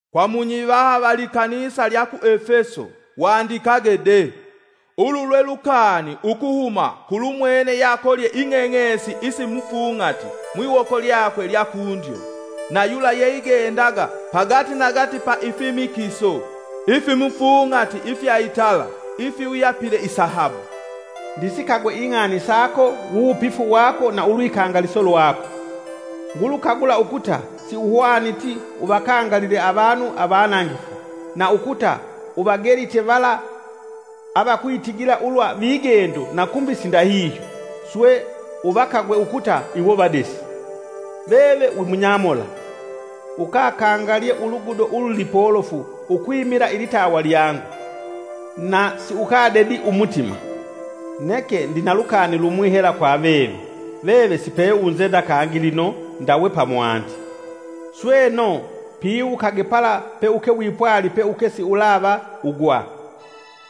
“Kwa munyivaha va likanisa lya ku Efeso wandikage de, ulu lwe lukani ukuhuma kulumwene yeakolye ing'eng'esi isi mufung'ati mwiwoko lyakwe lya kundyo, na yula ye igendaga pagatinagati pa ifimikiso ifimufung'ati ifya itala ifiwuyapile isahabu. Ndisikagwe ing'ani sako wuwupifu wako na ulwikangaliso lwako. Ngulukagula ukuta siuhwaniti uvakangalile avanu avanangifu, na ukuta uvagelite vala avakwitigila ulwa vigendo na kumbi sindahihyo, swe uvakagwe ukuta iwo vadesi. Veve wi munyamola, ukakangalye ulugudo ululipolofu ukwimila ilitawa lyangu, na siukadedi umutima. Neke ndina lukani lumwi hela kwa veve, veve sipeunzenda kangi lino ndawe pamwandi. Sweno, piwukage pala peuke wipwali peuke siulava ugwa,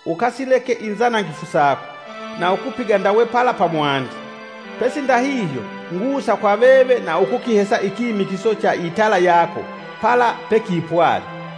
ukasileke inzanangifu sako, na ukupiga ndawe pala pamwandi. Pesi ndahihyo, ngusa kwa veve na ukukihesa ikimikiso cha itala yako pala pekipwali.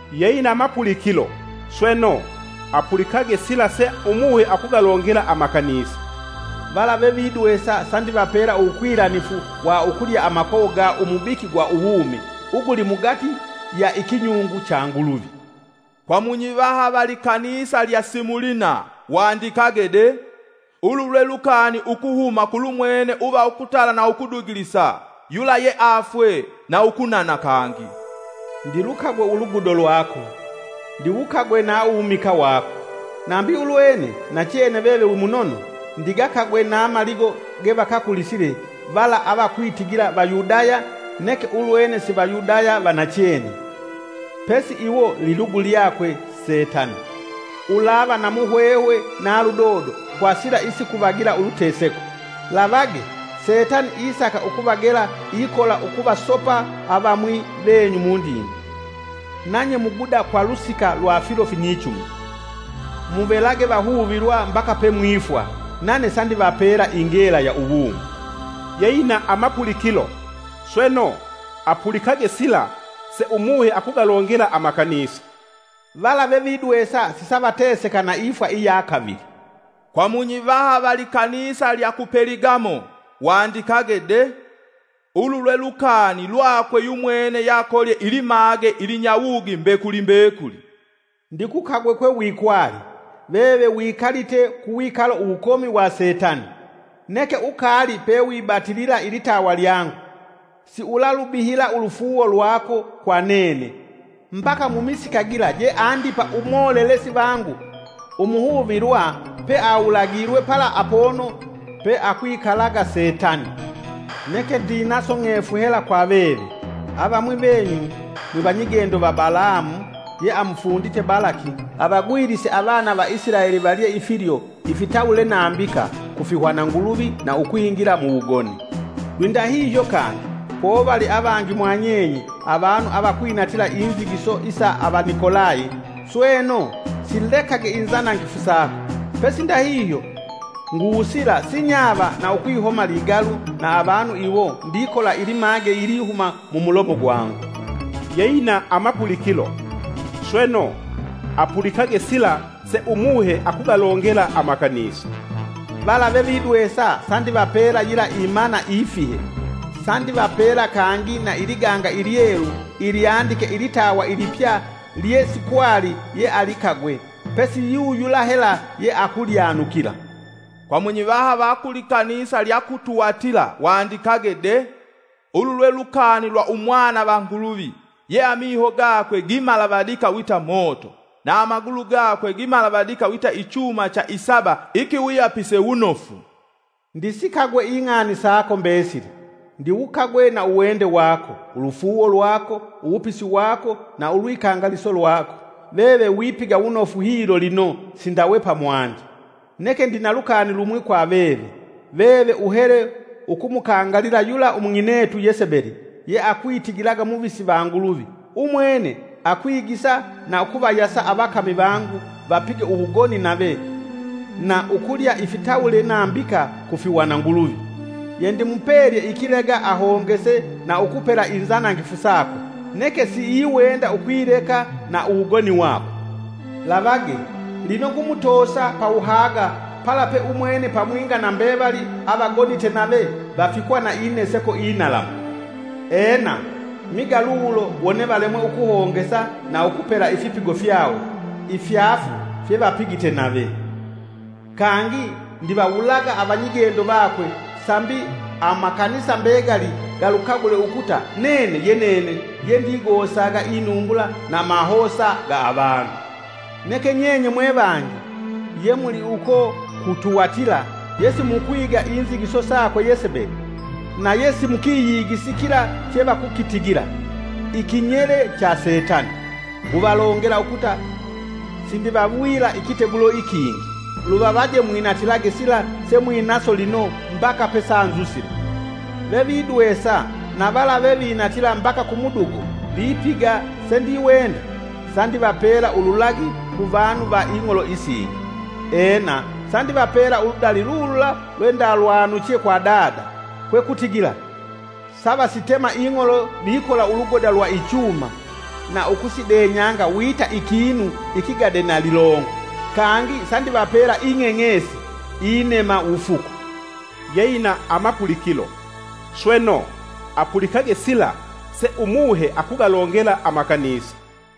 “Yeina mapulikilo, sweno, apulikage sila se Umuhe akugalongela amakanisa! “Vala vevidwesa sandivapela uwukwilanifu wa ukulya amakowo ga umubiki gwa uwumi uguli mugati ya ikinyungu cha Nguluvi. “Kwa munyivaha va likanisa lya Simulina wandikage de: Ulu lwe lukani ukuhuma kulumwene uva ukutala na ukudugilisa, yula yeafwe na ukunana kangi. Ndilukagwe ulugudo lwako; ndiwukagwe na uwumikaa wako, nambi ulwene nachene veve wimunono; ndigakagwe na maligo gevakakulisile vala avakwitigila Vayudaya neke ulwene si Vayudaya va nachene, pesi iwo lilugu lwakwe Setani. Ulava na muhwehwe na ludodo kwa sila isikuvagila uluteseko. Lavage! Setani isaka ukuvagela ikola ukuvasopa avamwi venyu mudinde; nanye muguda kwa lusika lwa filo finyichumi. Muvelage vahuvilwa mbaka pemwifwa, nane sandivapela ingela ya uwumi. “Yeina amapulikilo, sweno, apulikage sila se Umuhe akugalongela amakanisa! “Vala vevidwesa sisavateseka na ifwa iya kavili. “Kwa munyivaha va likanisa lya ku Peligamo wandikage de: Ulu lwe lukani lwakwe yumwene yakolye ilimage ilinyawugi mbekuli mbekuli. Ndikukagwe kwe wikwali; veve wikalite ku wikalo uwukomi wa Setani! Neke ukaali pewibatilila ilitawa lyangu; siulalubihila ulufuuwo lwako kwa nene mbaka mumisika gila je Andipa umolelesi vangu umuhuvilwa, peawulagilwe pala apono peakwilaga Setani. Neke ndinaso ng'efu hela kwa veve; avamwi venyu mwivanyigendo va Balamu yeamufundite Balaki avagwilise avana va Isilaeli valye ifilyo ifitawule nambika ku fihwananguluvi na ukwingila muwugoni. Lwindahihyo kangi, povali avangi mwanyenye avanu avakwinatila inzigiso isa Avanikolayi. Sweno, silekage inzanangifu sako. Pesi ndahihyo, ngusila sinyava na ukwihoma ligalu na avanu iwo ndikola ilimage ilihuma mumulomo gwangu. “Yeina amapulikilo, sweno, apulikage sila se Umuhe akugalongela amakanisa! “Vala vevidwesa sandivapela yila imana Imana: Chekilyo che atawe Nguluvi pevevali mubalali. ifihe. Sandivapela kangi na iliganga ilyelu ilyandike ilitawa ilipya lye sikwali yealikagwe pesi yu yula hela yeakulyanukila. “Kwa munyivaha va ku likanisa lya ku Tuwatila wandikage de: “Ulu lwe lukani lwa umwana va Nguluvi, ye amiho gakwe gamalavadike wita moto, na amagulu gakwe gimalavidika wita ichuma cha isaba ikiwuyapise wunofu. Ndisikagwe ing'ani sako mbesili. Ndiwukagwe na uwende wako, ulufuuwo lwako, uwupisi wako na ulwikangaliso lwako. Veve wipiga wunofu hilo lino sindawe pamwandi. Neke ndina lukani lumwi kwa veve; veve uhele ukumukangalila yula umung'inetu Yesebeli yeakwitigila muvisi va Nguluvi. Umwene akwigisa na ukuvayasa avakami vangu vapige uwugoni nave na ukulya ifitawule nambika ku fihwananguluvi. Yendimupelye ikilega ahongese na ukupela inzanangifu sakwe, neke siiwenda ukwileka na uwugoni wakwe. Lavage! Lino ngumutosa pawuhaga pala pe umwene pamwinga na mbevali avagonite nave vafikwa na ineseko inalamu. Ena, miga lulo wone valemwe ukuhongesa na ukupela ifipigo fyawo ifyaafu fyevapigite nave. Kangi ndivawulaga avanyigendo vakwe, sambi amakanisa mbegali galukagule ukuta nene ye nene yendigosaga inumbula na amahosa ga avanu. “Neke nyenye mwevangi yemuli uko ku Tuwatila yesimukwiga inzigiso sakwe Yesebeli; na ye simukiyigisi kila chevakukitigila, ‘Ikinyele cha Setani.’ Nguvalongela ukuta sindivawila ikitegulo ikingi. Luvavaje mwinatilage sila semwinaso lino mbaka pesanzusile. “Vevidwesa, na vala vevinatila mbaka ku mudugo vipiga sendiwenda, sandivapela ululagi ku vanu va ing'olo isingi, Ena, sandivapela uludali lulula lwendalwanuche kwa Dada; kwekutigila savasitema ing'olo vikola ulugoda lwa ichuma na ukusidenyanga wita ikinu ikigade na lilongo. Kangi sandivapela ing'eng'esi (inema wufuku) “Yeina amapulikilo, sweno, apulikage sila se Umuhe akugalongela amakanisa!